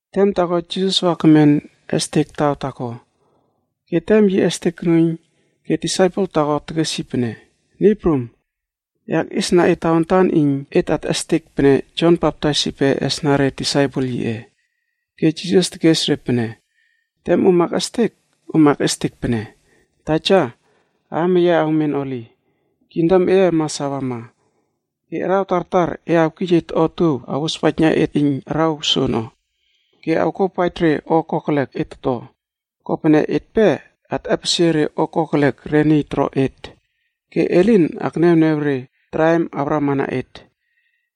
Tem taako Jisas wa kemen estek taw taako, ke tem yi estek konuiyn ke disaipel taako tekes yi pene, “Niy Prum, e akꞌiesna et tawantan iyn et atꞌestek pene Jon Baptais yipe esna re disaipel yiꞌe.” Ke Jisas tekes re pene, “Tem om akꞌestek, om awkes pene: ‘Taja, aam eye awmen Holi. kingdom eye mas awama. Ke araw tartar e awkij et otuow awospaijna et iyn araw soono. Ke awkuawpaij re o kokelek et toto, kopene etpe atꞌepesie re o kokelek re niy toro et. Ke e lin akniawniaw re o kokelek ono iyn awramana et.’”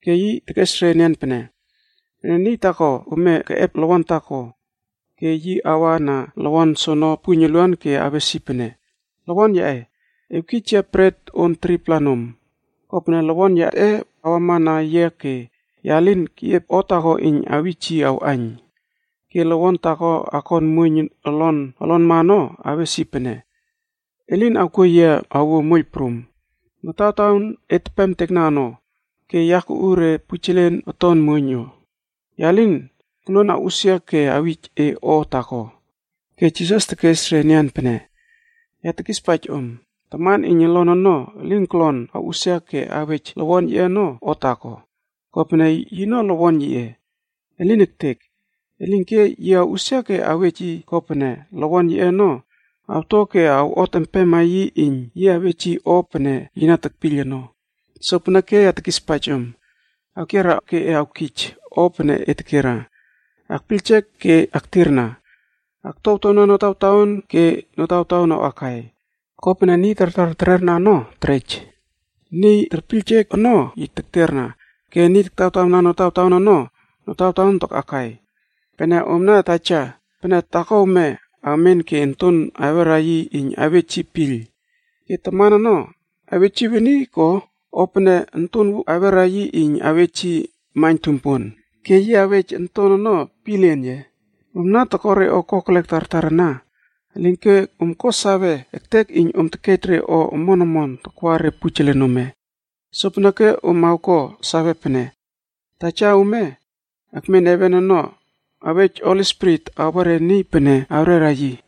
Ke yi tekes re enian pene, “Pene niy taako ome keꞌep lowon taako, ke yi awa na lowon soono puiyn uluan ke awes yi pene, ‘Lowon yaꞌe, awkij yia bret on 3-pla nom. Kopene lowon yaꞌe wama na yia ke ya lin keꞌiep o taako iyn awij yi awꞌaiyn.’ “Ke lowon taako akon muoiyn olon olonma ono awes yi pene, ‘E lin awkuo yia awuo moiyl prum, notawtaon et tepem ono ke ya kuꞌu re pujelen oton muoiyn no. Ya lin koluon awꞌusia ke awij e o taako.’” Ke Jisas tekes re enian pene, “Ya tekispaij om, taman iyn olon ono elin kolon awꞌusia ke awej lowon yiꞌe ono o taako, kopene yino lowon yiꞌe. Elin ektek! Elinke yi awꞌusia ke awej yi kopene lowon yiꞌe ono awto ke awꞌot empema yi iyn yi awej yi o pene yi na tekpiyl ono. “Sopeneke ya tekispaij om, awkiera ke e awkij o pene e tekera, akpiyljek ke e aktirna, aktuawtuawna notawtaon ke notawtaon awꞌakai. Kopene niy tartar terera ono terej, niy tekpiyljek ono yi tekterna, ke niy taktawtawna notawtaon ono, notawtaon takꞌakai. “Pene omna taja, pene taako ome awmen ke onton awera yi iyn awej yi piyl, ke taman ono awej yi weni ko? O pene onton awera yi iyn awej yi maiyn tumpuon, ke yi awej onton ono pielien ye? Omna toko re o kokelek tartar ana, elinke om ko sawe ektek iyn om tekej re o omon omon takwa re pujelen ome. Sopeneke om awko sawe pene Taja ome ekmen heven ono awej Holi Spirit awa re niy pene awrera yi!”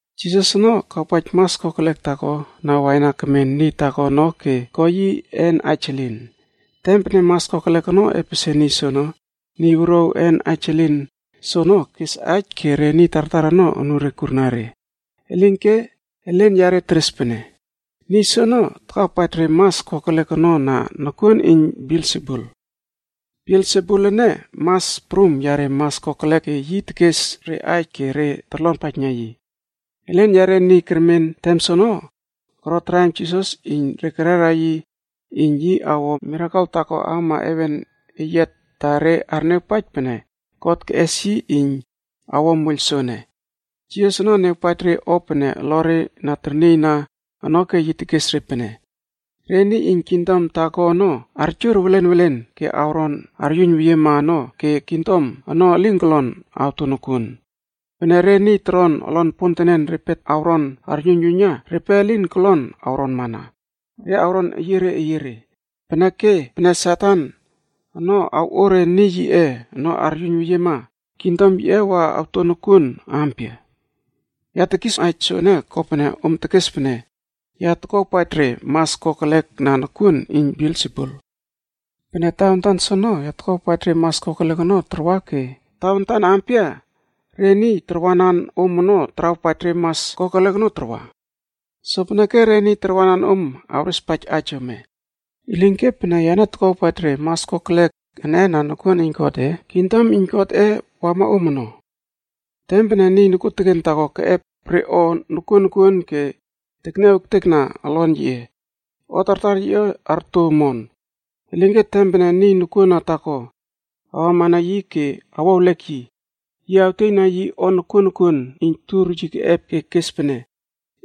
Jisas ono kawpaij mas kokelek taako na waina kemen niy taako ono ke ko yi een aij elin. Tem pene mas kokelek ono epesie niy soono, niy wuruaw een aij elin soono kes aij ke re niy tartar ono anure kurna re. Elinke elen yare teres pene, “Niy soono takawpaij re mas kokelek ono na nokuon iyn Belsebulono. Belsebula ene mas prum yare mas kokelek ke yi tekes re aij ke re torlonpaijna yi.” Elen yare niy kermen tem soono koro traim Jisas iyn re kerera yi iyn yi awo mirakel taako awama heven eyiat ta re arniawpaij pene God keꞌes yi iyn awo moiyl soene. Jisas ono niawpaij re o pene olore na ternieyna ono ke yi tekes re pene, “Re niy iyn kingdom taako ono, arjur welen welen ke awron aryuiyn weyiema ono ke kingdom ono elin kolon awto nokuon. Pene re niy toron olon pontenen repe awron aryuiynyuiyna, repe lin kolon awronmana, re awron eyiere eyiere. Peneke, pene Satan ono awꞌo re niy yiꞌe ono aryuiynyuiyna, kingdom yiꞌe wa awto nokuon ampia? Ya tekis aij soene kopene om tekes pene ya takuawpaij re mas kokelek na nokuon iyn Belsebul. Pene tawantan soono, ya takuawpaij re mas kokelek ono tarwa ke tawantan ampia re niy tarwanan om ono tarawpaij re mas kokelek ono tarwa? Sopeneke, re niy tarwanan om awrespaij aij ome. Elinke, pene yane tokuawpaij re mas kokelek ene na nokuon iyn Godꞌe, kingdom iyn Godꞌe wama om ono. “Tem pene niy nokuoteken taako keꞌep re o nokuon nokuon ke tekniaw ektekna olon yiꞌe, o tartar yiꞌe arto omon. Elinke tem pene niy nokuona taako awama na yi ke awo ewlek yi, yi awtieyna yi o nokuon nokuon iyn tur yi keꞌep ke kes pene,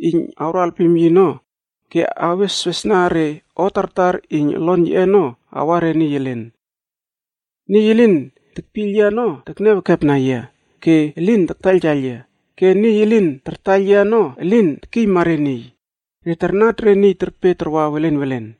iyn awro alpim yi ono ke aweswesna re o tartar iyn olon yiꞌe ono awa re niy elen. “Niy elin tekpiyl yia ono tekniaw ekepna yia ke elin tartaiyltaiyl yia. Ke niy elin tartaiyl yia ono elin tekiyma re niy, re tarnat re niy terpe tarwa welen welen.”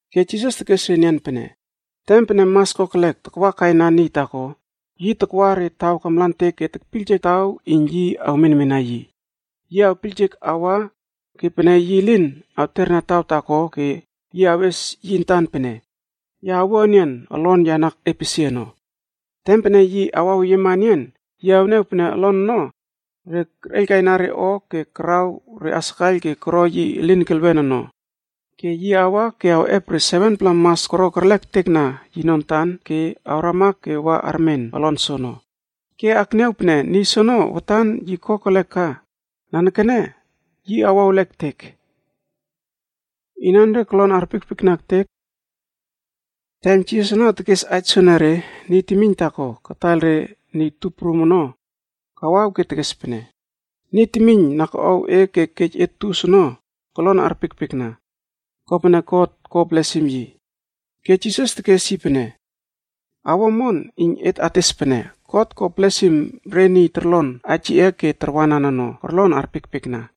Ke Jisas tekes enian pene, “Tem pene mas kokelek takwa kaina niy taako, yi takwa re taw kamlantek ke tekpiyljek taw iyn yi awmenmena yi. Yi awpiyljek awa ke pene yi lin awterna taw taako ke yi awes yi antan pene, ‘Ya awua enian olon ya na epesie ono.’ Tem pene yi awaweyiema enian, yi awniaw pene olon ono re kerꞌeiylkaina re o ke karaw re asakaiyl ke koro yi elin kelwenb ono. Ke yi awa ke awꞌep re 7-pla mas koro kerlek ektekna yino antan ke awrama ke wa armen olon soono. Ke akniaw pene niy soono watan yi kokelek ka, nanekene yi awo ewlek ektek.” Inanre kolon arpiekpiekna ektek? Tem Jisas ono tekes aij soenere, niy temiyn taako kataiyl re niy tup prum ono kawaw ke tekes pene, “Niy temiyn na koꞌow e ke kej e tus ono kolon arpiekpiekna, kopene God ko blesim yi.” Ke Jisas tekes yi pene, “Awo omon iyn et ates pene, God ko blesim re niy torlon aij yiꞌe ke tarwanan ono, korlon arpiekpiekna.”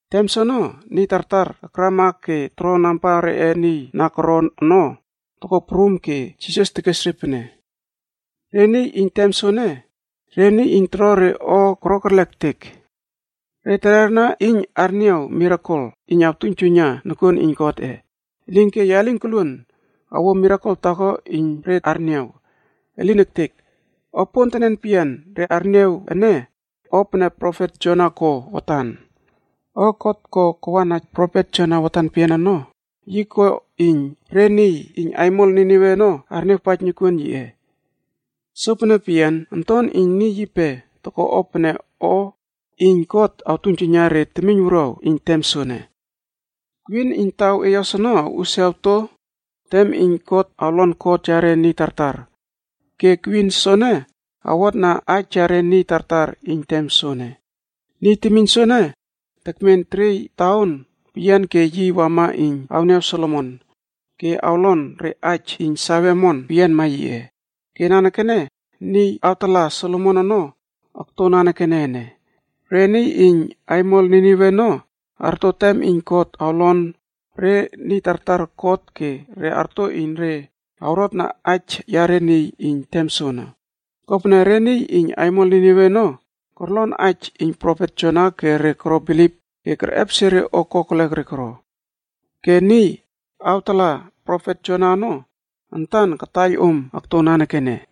Tem soono niy tartar akrama ke toro namba reꞌe niy na koron ono toko prum ke Jisas tekes re pene, “Re niy iyn tem soene, re niy iyn toro re o koro kerlek ektek. Re terera iyn arniaw mirakel iyn awtuiynjuiyna nokuon iyn Godꞌe. Elinke ya lin koluon awuo mirakel taako iyn re arniaw. Elin ektek! O pontenen peyian re arniaw ene, o pene profet Jona ko watan. O God ko kawana profet Jona watan peyian ono, yi ko iyn re niy iyn aimol Ninive ono arniawpaij nokuon yiꞌe. Sopene peyian, Onton iyn Niy yipe okto pene o iyn God toktuiynjuiyna re temiyn wuruaw iyn tem soene. Kwin iyn taw eyos ono awꞌusia awto tem iyn God awlon kot yare niy tartar, ke Kwin soene awotna aij yare niy tartar iyn tem soene. Niy temiyn soene tekmen teriey taon peyian ke yi wama iyn awniaw Solomon ke awlon re aij iyn sawe omon peyianma yiꞌe. Ke nanekene niy awtala Solomon ono akto nanekene ene. Re niy iyn aimol Ninive ono arto tem iyn God awlon re niy tartar kot ke re arto iyn re awrotna aij yare niy iyn tem soene. Kopene re niy iyn aimol Ninive ono korlon aij iyn profet Jona ke re koro bilip ke kerꞌepesie re o kokelek re koro. Ke niy awtala profet Jona ono antan kataiyl om okto nanekene.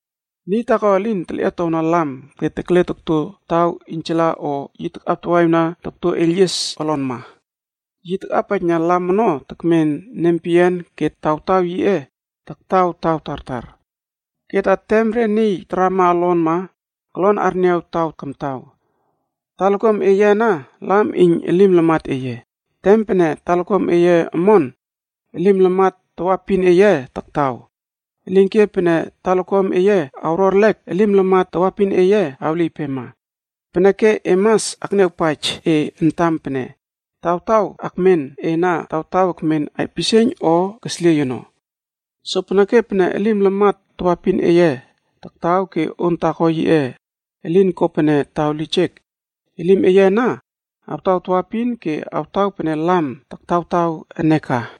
“Niy taako elin telꞌietowna lam ke tekle tokto taw iynjala o yi takꞌaptawaꞌiwna tokto eiylyies olonma. Yi takꞌapaijna lam ono tekmen nempeyian ke tawtaw yiꞌe taktaw taw tartar. Ke ta tem re niy tarama olonma kolon arniaw taw kamtaw. Talakuam eye ana lam iyn elim lamat eye. Tem pene talakuam eye omon, elim lamat tawaepin eye taktaw. Elinke pene talakuam eye awro erlek, elim lamat tawaepin eye awliypema. Peneke e mas akniawpaij e antam pene tawtaw akmen e ana, taktaw ekmen aipisieiyn o kesliey ono? Sopeneke, pene elim lamat tawaepin eye taktaw ke on taako yiꞌe elin ko pene taw lijek, elim eye ana awtaw tawaepin ke awtaw pene lam taktawtaw e ene ka.”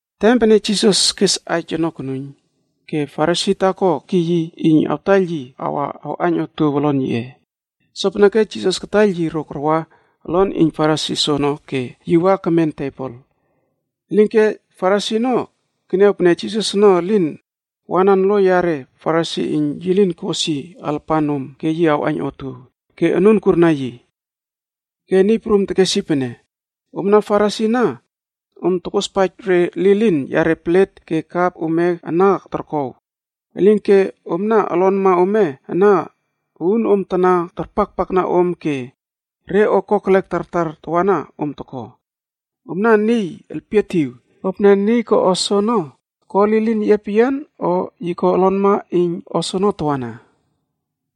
Tem pene Jisas kes aij ono konuiyn, ke Farisi taako kekiy yi iyn awtaiyl yi wa awꞌaiyn otuow olon yiꞌe. Sopeneke Jisas kataiyl yi ro karwa olon iyn Farisi soono ke yi wa kemen tebol. Elinke Farisi ono keniaw pene Jisas ono elin wanan lo yare Farisi iyn yi lin kos yi alapan nom ke yi awꞌaiyn otuow, ke anun kurna yi. Ke Niy Prum tekes yi pene, “Omna Farisi ana om tokospaij re lilin yare plet ke kap ome ana torkow, elinke omna olonma ome ana uunom tana tarpakpakna om ke re o kokelek tartar tawana om toko. Omna niy elpietiw! Kopene niy ko o soono, ko lilin yiꞌe peyian, o yi ko olonma iyn o soono tawana?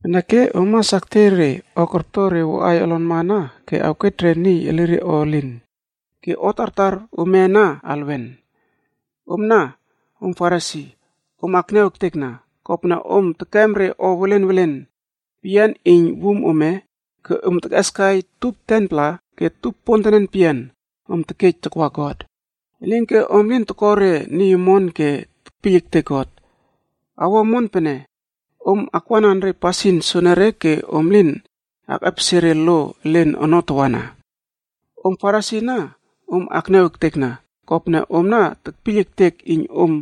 Peneke om mas aktiey re o korto re woꞌaiy olonma ana ke awkej re niy elire o elin ke o tartar ome ana alwen. “Omna om Farisi, om akniaw ektekna, kopene om tekem re o welen welen peyian iyn wum ome ke om tekꞌeskai tup 10-pla ke tup pontenen peyian om tekej takwa God. Elinke om lin toko re niy omon ke tekpiyl ektek God. Awo omon pene om akwanan re pasin soenere ke om lin akꞌepesie re lo elen ono tawana. “Om Farisi ana om akniaw ektekna, kopene omna tekpiyl ektek iyn om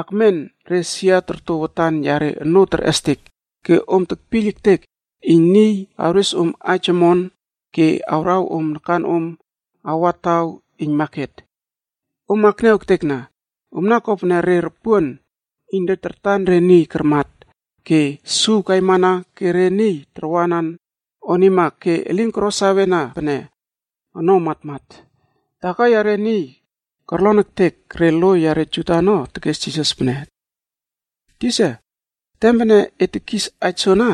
akmen re sia torto watan yare onoo terꞌestek ke om tekpiyl ektek iyn niy awres om aij omon ke awraw om nakanom awa taw iyn maket. “Om akniaw ektekna, omna kopene re ropuon iyn re kartan re niy karmat ke suw kaimana ke re niy tarwanan onima ke elin koro sawena pene ono matmat.” Taako yare niy korlon ektek re lo yare Juda ono tekes Jisas pene, “Tisa, tem pene e tekis aij soana,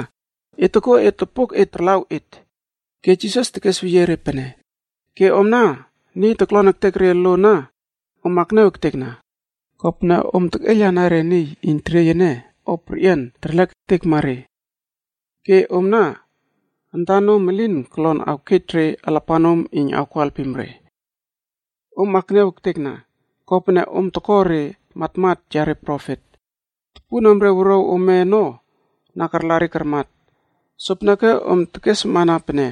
e tokuo et lopok et tarlaw et.” Ke Jisas tekes weyie yi pene, “Ke omna niy kolon ektek re lo ana om akniaw ektekna, kopene om tekꞌeiylana re niy iyn tertiey o perꞌian terlek ektekma re. Ke omna antanom elin kolon awkej re alapanom iyn awko alpim re. “Om akniaw ektekna, kopene om toko re matmat yare profet. Topunomre wuruaw ome ono na karla re karmat. Sopeneke om tekeswawna pene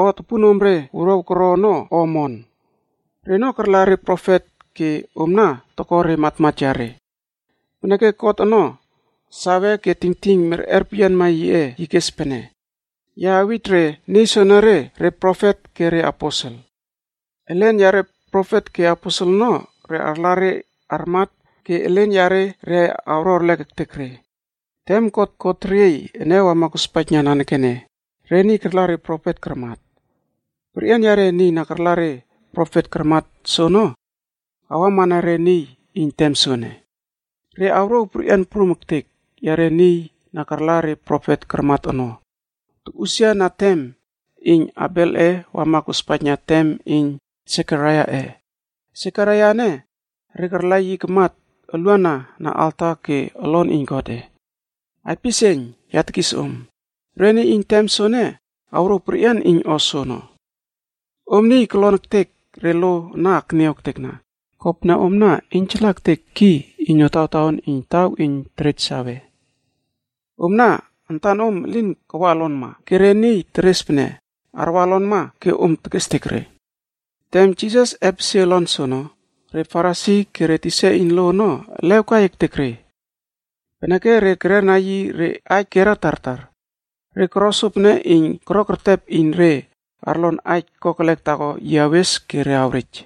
o topunomre wuruaw koro ono o omon. Reno karla re profet ke omna toko re matmat yare. Peneke God ono sawe ke tingting merꞌer peyianma yiꞌe, yi kes pene, ‘Ya awij re niy soenere re profet ke reaposel. Elen yare profet ke aposel ono re arla re armat ke elen yare re awro erlek ektek re.’ Tem God ko teriey ene wama kospaijna nanekene, re niy karla re profet karmat. Perꞌian yare niy na karla re profet karmat soono, awamana re niy iyn tem soene. Re awrouw perꞌian prum ektek yare niy na karla re profet karmat ono, tokꞌusia na tem iyn Abelꞌe wama kospaijna tem iyn Sekaraiaꞌe. Sekaraia ene re karla yi kamat uluana na alta ke olon iyn Godꞌe. Aipisieiyn, ya tekis om, re niy iyn tem soene awrouw perꞌian iyn o soono. “Om niy kolon ektek re lo ana akniaw ektekna, kopene omna iynjala ektek ki iyn notawtaon iyn taw iyn terej sawe. Omna antanom elin kawa olonma, ke re niy teres pene arwa olonma ke omna tekestek re.” Tem Jisas epesie olon soono, re Farisi ke re tisa iyn lo ono elew kai ektek re, peneke re kererna yi re aij kierna tartar. Re koro sopene iyn korokertep iyn re arlon aij kokelek taako yi awes ke re awrej.